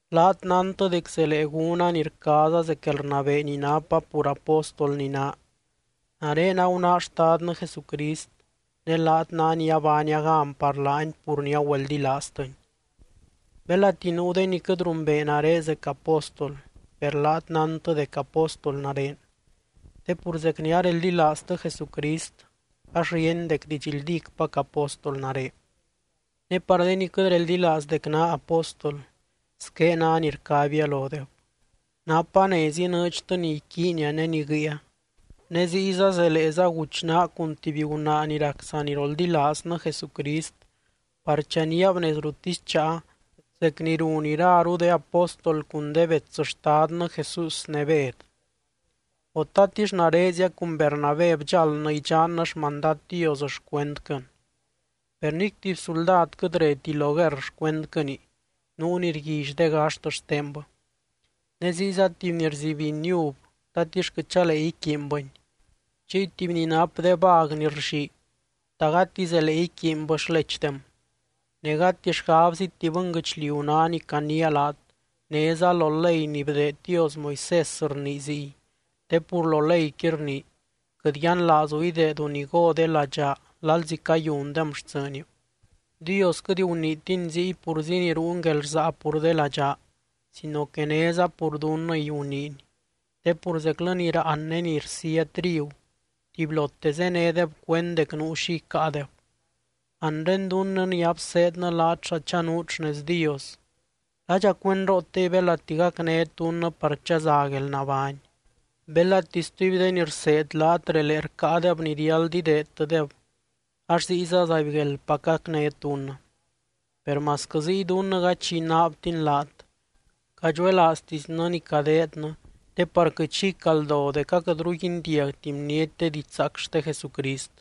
Laat nántɨ dec zelee gúna ni rcaaza zec guelrnabee ni napa pur apóstol ni naa. Nare agunáa Xtadnɨ Jesucrist ne laat ná ni abaania gan par laany pur ni agüeldilaaztɨny. Belati nuu de ni quɨt rumbee nare zec apóstol, per laat nántɨ dec apóstol nare. Te pur zec ni areldilaaztɨ Jesucrist ax ríeny dec didxldícpac apóstol nare. Ne par de ni quɨt reldilaaz dec naa apóstol, squé ná ni rcabia lodeb: Napa nez inɨɨdxtɨ ni iquiinia ne ni guɨia. Ne ziyza zeleeza guchnaa cun tuby gunaa ni rac saniroldilaaznɨ Jesucrist par chaníab nez ruttisy cháa, zec ni run iraru de apóstol cun de bets Xtadnɨ Jesús ne Bed. O, ¿tatix narezia cun Bernabé bdxáldnɨ idxannɨ xmandad Dios xcuendquɨn? Per nic tuby suldad quɨt reti lo guerr xcuendquɨni, nuu ni rguilly de gaxt xtenbɨ. Ne ziyza tuby ni rzibiny uv, ¿tatix quɨt chalee iquiinbɨni? Chiy tuby ni nap de vag ni rllii, ¿ta gati zelee iquiinbɨ xlechdem? Ne gati xgabziti bɨnguɨchliu ná ni caniia laat, néza lo ley ni bdeed Dios Moisés rnii ziy. Te pur lo leyqui rnii: “Quɨt yianlaazu ideedu ni go de ladxaa lalzi cayundem xtsɨɨniu.” Dios quɨt guniitiny ziy purzi ni ruuny guelrsaa pur de ladxaa, sino que néza pur dunnɨy guniiny. Te pur zeclɨ ni raan ne ni rsía trigu, tubylote zénedeb cuend dec nuu xi icáadeb. Anre dunnɨ ni abseednɨ laat xa chanuut xnez Dios, ¿ladxa cuendrootey belati gacnét dunnɨ par chaza guelnabány? Belati stuby de ni rseed laat relee rcáadeb ni riáld ideedtɨdeb, ax ziyza zaibgueldpac gacnét dunnɨ. Per masquɨ ziy dunnɨ gady xi inaabtin laat, cadxuelaaztisnɨ ni cadeednɨ te par quɨt xi icaldo dec aquɨtru guindiagti bniety de didxzaac xte Jesucrist.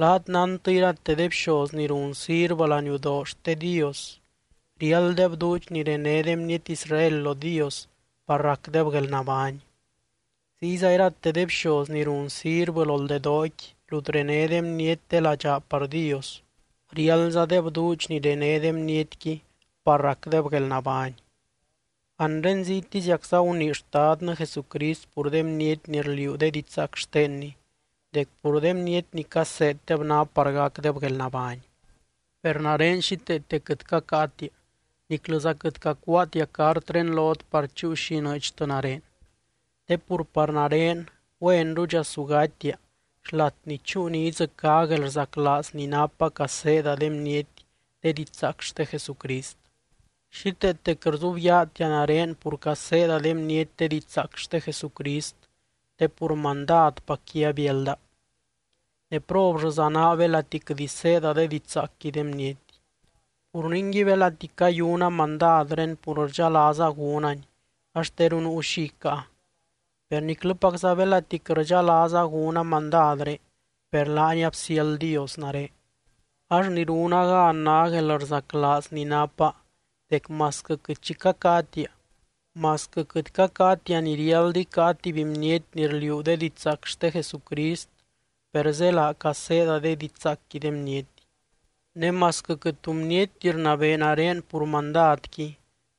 Laat nántɨ, irate de bxoz ni run sirvɨ laniudoo xte Dios, riálddeb duudx ni rené de bniety Israel lo Dios par racdeb guelnabány. Ziyza irate de bxoz ni run sirvɨ loldedooqui rut rené de bniety de ladxaa par Dios, riáldzadeb duudx ni rené de bnietqui par racdeb guelnabány. Anre ziytiziacza gunii Xtadnɨ Jesucrist pur de bniety ni rliuu de didxzaac xtenny, dec pur de bniety ni caseeddeb ná par gacdeb guelnabány. Per nare xíteete quɨt cacáatia, niclɨza quɨt cacuaatia cartré lot par chúu xi inɨɨdxtɨ nare. Te pur par nare güenrudxa su gatia xlat ni chúu ni idzɨcá guelrzaclaaz ni napa caseeda de bniety de didxzaac xte Jesucrist. Xíteete quɨt rzubyaatia nare pur caseeda de bniety de didxzaac xte Jesucrist, te pur mandadpacqui abiálda. ¡Ne prollɨza naa belati quɨt iseeda de didxzaacqui de bniety! Pur ningui, belati cayuna mandadré pur rdxalaaza gúnani, ax teru nuu xi icáa. Per niclɨpacza belati quɨt rdxalaaza gúna mandadré, per laani absiáld Dios nare. Ax ni runa gan ná guelrzaclaaz ni napa dec masquɨ quɨt xi cacáatia, masquɨ quɨt cacáatia ni riáld icáa tuby bniety ni rliuu de didxzaac xte Jesucrist per zélaa caseeda de didxzaacqui de bniety. Ne masquɨ quɨt tu bnietti rnabee nare pur mandadqui,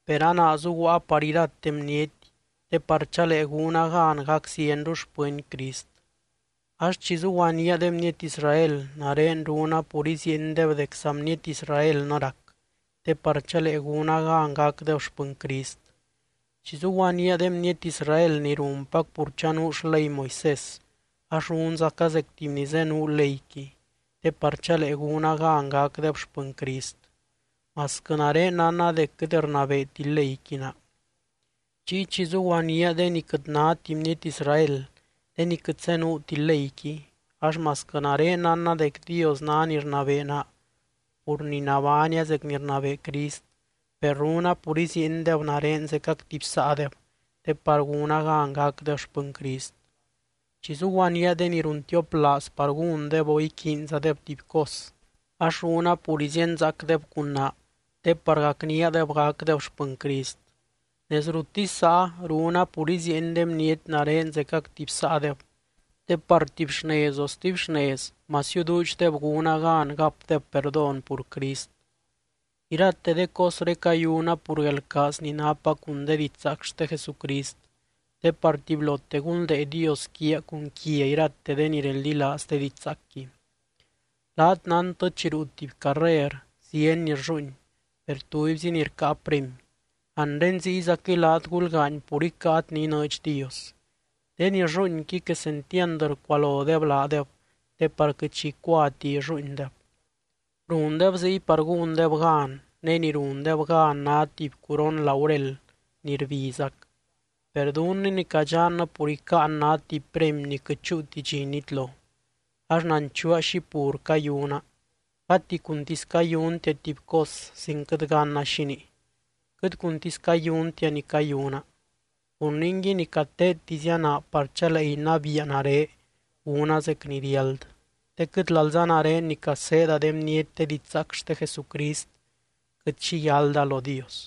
per a naa zuguaa par irate bniety te par chalee gúna gan gac zienru xpɨny Crist. Ax chi zuguaníaa de bniety Israel, nare runa pur iziiendeb dec saa bniety Israelnɨ rac te par chalee gúna gan gacdeb xpɨny Crist. Chi zuguaníaa de bniety Israel ni runpac pur chanuu xley Moisés ax runzaca zec tuby ni zenuu leyqui, te par chalee gúna gan gacdeb xpɨny Crist (masquɨ nare nánna dec quɨt rnabeeti leyqui naa). Chiy chi zuguaníaa de ni quɨt náti bniety Israel, de ni quɨt zenuuti leyqui ax masquɨ nare nánna dec Dios ná ni rnabee naa pur ni nabánia zec ni rnabee Crist, per runa pur iziiendeb nare zecac tuby saadeb te par gúna gan gacdeb xpɨny Crist. Chi zuguaníaa de ni runtioplaaz par gúndeb o iquiinzadeb tuby cos, ax runa pur izíenzaacdeb cun naa te par gacníadeb gacdeb xpɨny Crist. Nez ruttisy záa runa pur iziieny de bniety nare zecac tuby saadeb, te par tuby xnez o stuby xnez masiu duudxdeb gúna gan gapdeb perdón pur Crist. Irate de cosré cayuna pur guelrcaaz ni napa cun de didxzaac xte Jesucrist, te par tubylote gunldee Dios quiaa cun quia irate de ni reldilaaz de didxzaacqui. Laat nántɨ chi ruu tuby carrer zieny ni rlluuin, per tubyzi ni rcáa premy. Anre ziyzaquɨy laat gulgaany pur icáat ni inɨɨdx Dios. De ni rlluuinqui quesentiand rcualodeb laadeb te par quɨt xi icuati illuuindeb. Rundeb ziy par gúndeb gan, ne ni rundeb gan ná tuby curon laurel ni rbizac. Per dunnɨ ni cadxannɨ pur icáan ná tuby premy ni quɨt chúuti dxi nitlo. Ax nanchuua xi pur cayuna, gati cuntisy cayuntia tuby cos sin quɨt ganna xínii, quɨt cuntisy cayuntia ni cayuna. Pur ningui ni cateettizia naa par chalee inabiia nare gúna zec ni riáld, te quɨt lalza nare ni caseeda de bniety de didxzaac xte Jesucrist, quɨt xi yálda lo Dios.